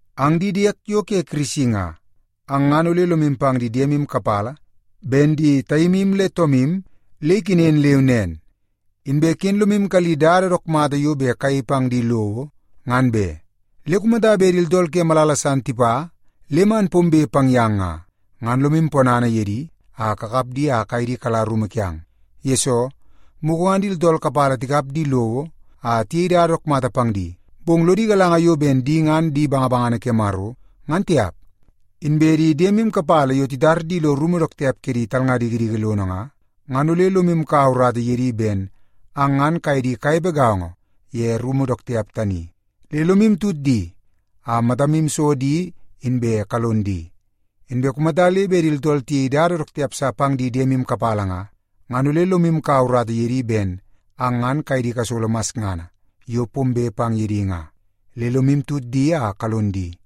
Ang di diek yo ke Kirisi nga, ang ngan ole lomu pang di diemu kapala ben di taimu le toomu le ikenen leu nen. Inbe ken lomu kalli dada dook mata yo bet kayei pang di lowo, ngan be. Le kumata bet di tooltool ke malala san tipa le man pombe pang yang nga, ngan lomu ponana ye di a kakap di a kaye di kala rumu kiang. Yesoo, mugu ngan di tooltool kapala tikap di lowo a tiyei dada dook mata pang di, bong lodi galanga yo ben di ngan di bangabangana ke Maro, ngan tiap. Inbe di diemu kapala yo titar di lo rumu dook tiap ke di talnga dikidiki lono nga, ngan ole lomu kaua urata ye di ben ang ngan kaye di kanepe gaongo ye rumu dook tiap tani. Le lomu tut di a matamu so di inbe kalon di. Inbe kumata le bet di tooltool tiyei dada dook tiap sa pang di diemu kapala nga, ngan ole lomu kaua urata ye di ben ang ngan kaye di kasolo masngana yo pombe pang ye di nga. Le lomu tut di a kalon di.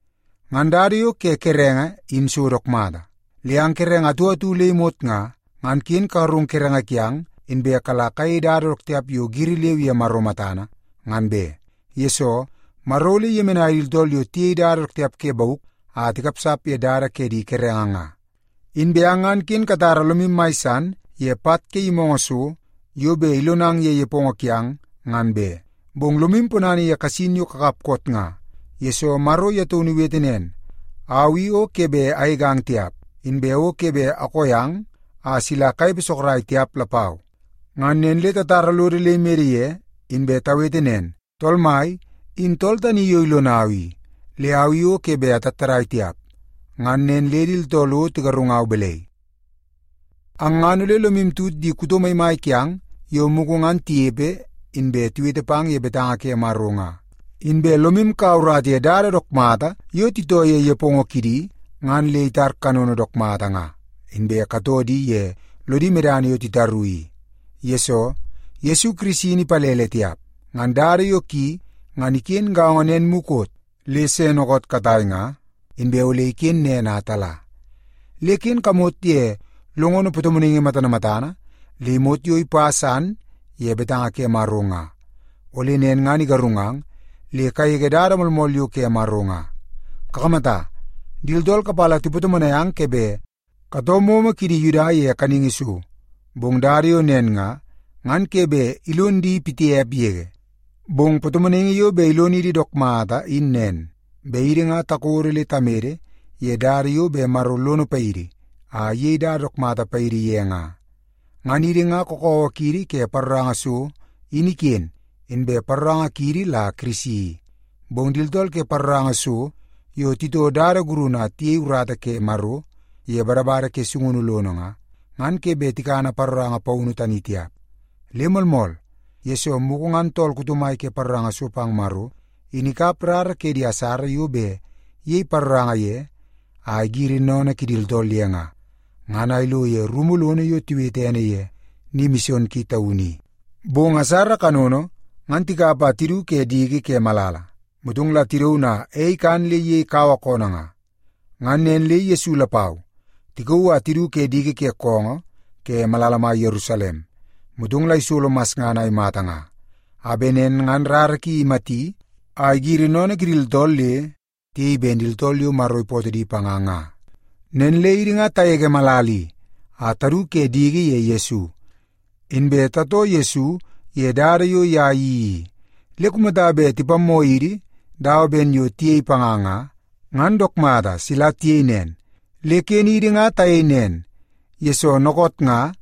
Ngan dada yo ke kerenge in so dook mata. Le ang kerenge atu atu le imot nga, ngan ken kagarung kerenge kiang inbe kala kayei dada dook tiap yo giri leu ye Maro matana, ngan be. Yesoo, Maro ole iyemenai di tooltool yo tiyei dada dook tiap ke bauk a tikapsap ye dada ke di kerenge nga. Inbe ang ngan ken katara lomu mai san ye pat ke yimoongoo so yo bet ilonang ye nepongo kiang, ngan be. Bong lomu ponana ye kasin yo kakap koot nga, yesoo Maro ye taunu iwete nen; “Au i o ke bet agegang tiap, inbe o ke bet akoo yang a sila kanepe sorok tiap lapau.” Nen le tatara lodo le imede ye, inbe tawete nen, “Tool Mai in tool tani yo ilonau i, le au i o ke bet atattadai tiap. Ngan nen le di tooltool o tigarungau balai?” Ang ngan ole lomu tut di kuto maimai kiang yo mugu ngan tinepe inbe tiwete pang ye betanga ke Maro nga. Inbe lomu kaua urata ye dada dook mata yo titoo ye nepongo kidi ngan le itar kanono dook mata nga, inbe katoo di ye lodi medana yo titaru i. Yesoo, Yesu Kirisi in ipalele tiap. Ngan dada yo ki, ngan iken gaongo nen mukot, le se dookoot katai nga, inbe ole iken nen a tala. Le ken kamot ye longono patomonaingi matana matana le imot yo ipa san ye betanga ke Maro nga, ole nen ngan igarungang le kagege dada moolmool yo ke Maro nga. Kakamata, di tooltool kapala tipatomonai ang ke bet katoo momo kidi Yuda ye kaningi so, bong dada yo nen nga, ngan ke bet ilon di pitiap yege. Bong patomonaingi yo bet ilonidi dook mata in nen, bet idi nga takodo le tamede ye dada yo bet Maro lono paidi a iyei dada dook mata paidi ye nga. Ngan idi nga kakawa kiidi ke paroranga so in iken, inbe paroranga kiidi la Kirisi i. Bong di tooltool ke paroranga so yo titoo dada gurunu a tiyei urata ke Maro ye badabada ke sungunu lono nga, ngan ke bet tikana paroranga paunu tani tiap. Le moolmool, yesoo mugu ngan tool kuto mai ke paroranga so pang Maro, in ikap rara ke di asara yo bet iyei paroranga ye a igiri sennene kidi tooltool ye nga, ngan a ilo ye rumu lono yo tiwete ene ye Ni Mison Ki Taunu i. Bong asara kanono, ngan tikap a tidu ke diki ke malala, motong la tidaun a ei ikan le iyei kaua koonoo nga. Ngan nen le Yesu lapau, tikauu a tidu ke diki ke koongoo ke malala mai Yerusalem, motong la isolo masngana a imata nga, a bet nen ngan rara ki imati a igiri sennene kidi tooltool le tiyei ben di tooltool yo Maro ipootoo di panga nga. Nen le idi nga tagege malala i a tadu ke diki ye Yesu, inbe tatoo Yesu ye dada yo ye iyeii i. Le kumata bet tipammoo idi dawa ben yo tiyei panga nga, ngan dook mata sila tiyei nen. Le ken idi nga tayei nen, yesoo dookoot nga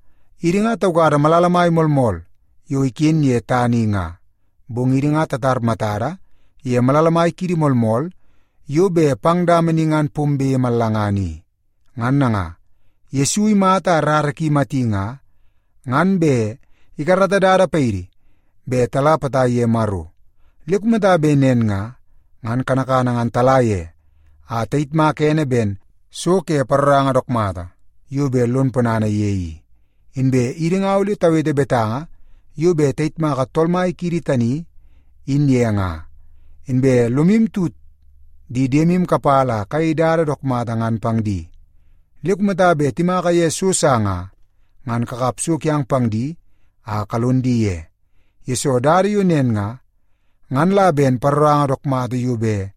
idi nga taukada malala mai moolmool yo iken ye tana i nga, bong idi nga tatar matada ye malala mai kiidi moolmool yo bet pang dama ni ngan pombe mallangana i. Ngan nanga, Yesu imata a rara ki imati nga, ngan bet ikarata dada paidi bet tala potai ye Maro. Le kumata bet nen nga, ngan kanakana ngan tala ye a tayitmaka ene ben so ke paroranga dook mata yo bet lon ponana ye i. Inbe idi nga ole tawete betanga yo bet tayitmaka Tool Mai kiidi tani in ye nga. Inbe lomu tut di diemu kapala a kayei dada yo dook mata ngan pang di. Le kumata bet timaka ye so sa nga, ngan kakap so kiang pang di a kalon di ye, yesoo dada yo nen nga, ngan la ben paroranga dook mata yo bet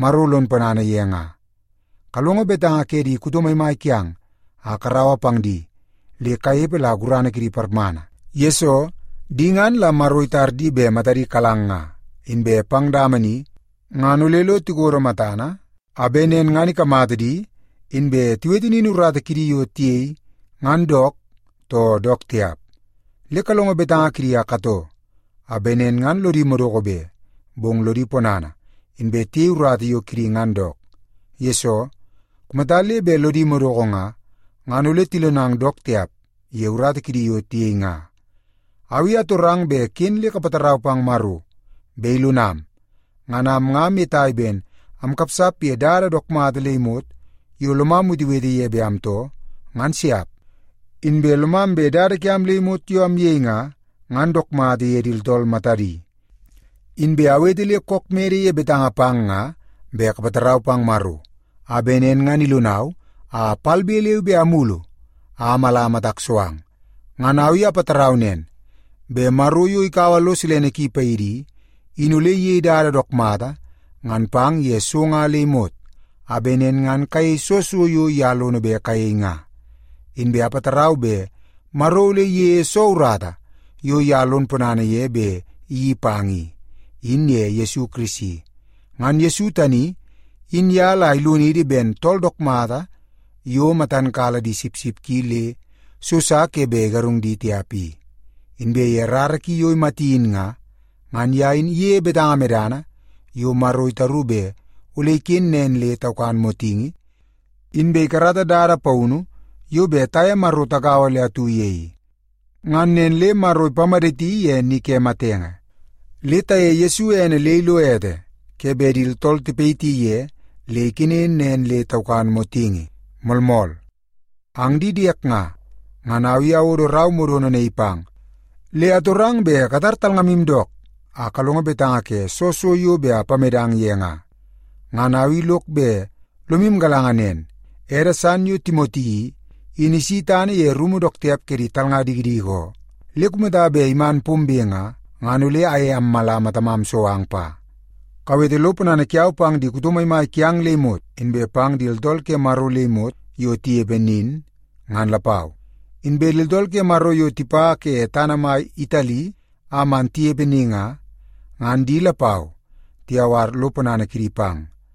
Maro lon ponana ye nga. Kalongo betanga ke di kuto maimai kiang a karaua pang di le kanepe la gurana kidi parmana. Yesoo, di ngan la Maro itar di bet matadi kalang nga, inbe pang dama ni ngan ole lo tikodo matana, a bet nen ngan ikamata di, inbe tiwete nin urata kidi yo tiyei ngan dook, too dook tiap. Le kalongo betanga kidi a katoo, a bet nen ngan lodi madoko be, bong lodi ponana, inbe tiyei urata yo kidi ngan dook. Yesoo, kumata le bet lodi madoko nga, ngan ole tilonang dook tiap ye urata kidi yo tiyei nga. Au i atorang bet ken le kapatarau pang Maro bet ilonam. Ngan am nga amyetai ben amkapsap ye dada dook mata le imot yo lomam wetewete ye bet amtoo, ngan siap. Inbe lomam bet dada kiam le imot yo amyei nga, ngan dook mata ye di tooltool matadi. Inbe awete le kook mede ye betanga pang nga bet kapatarau pang Maro, a bet nen ngan ilonau a palbe leu be amulu a amala matak so ang. Ngan au i apatarau nen, bet Maro, yo ikaua lo silene ki paidi i, in ole iyei dada yo dook mata ngan pang ye so nga le imot, a bet nen ngan kayei soo so yo ye lono bet kayei nga. Inbe apatarau bet Maro ole iyeie soo urata yo ye lon ponana ye bet iyeii pang i, in ye Yesu Kirisi. Ngan Yesu tani in ye la ilonidi ben tool dook mata yo matan kala di sipsip ki le so sa ke bet igarung di tiap i. Inbe ye rara ki yo imati in nga, ngan ye in iyeie betanga medana yo Maro itaru bet ole iken nen le taukan motingi, inbe ikarata dada paunu yo bet taye Maro tagaua le atu ye i. Ngan nen le Maro ipamaditi ye ni ke matenge. Le tayeie Yesu ene le ilo ete ke bet di tooltool tipayiti ye le ikenen nen le taukan motingi. Moolmool! Ang di diek nga, ngan au i awodo rau modono naii pang, le atorang bet katar talngamu dook a kalongo betanga ke soo so yo bet apamedang ye nga. Ngan au i lok bet lomu galanga nen, ede san yo Timoti i, in isi tana ye rumu dook tiap ke di talnga dikidiki oo. Le kumata bet iman pombe nga, ngan ole aye ammala matamam so ang pa. Kawete lo ponana kiau pang di kuto maimai kiang le imot, inbe pang di tooltool ke Maro le imot yo tinepe nin, ngan lapau. Inbe di tooltool ke Maro yo tipa ke tana mai Itali a man tinepe ni nga, ngan di lapau tiyawar lo ponana kidi pang.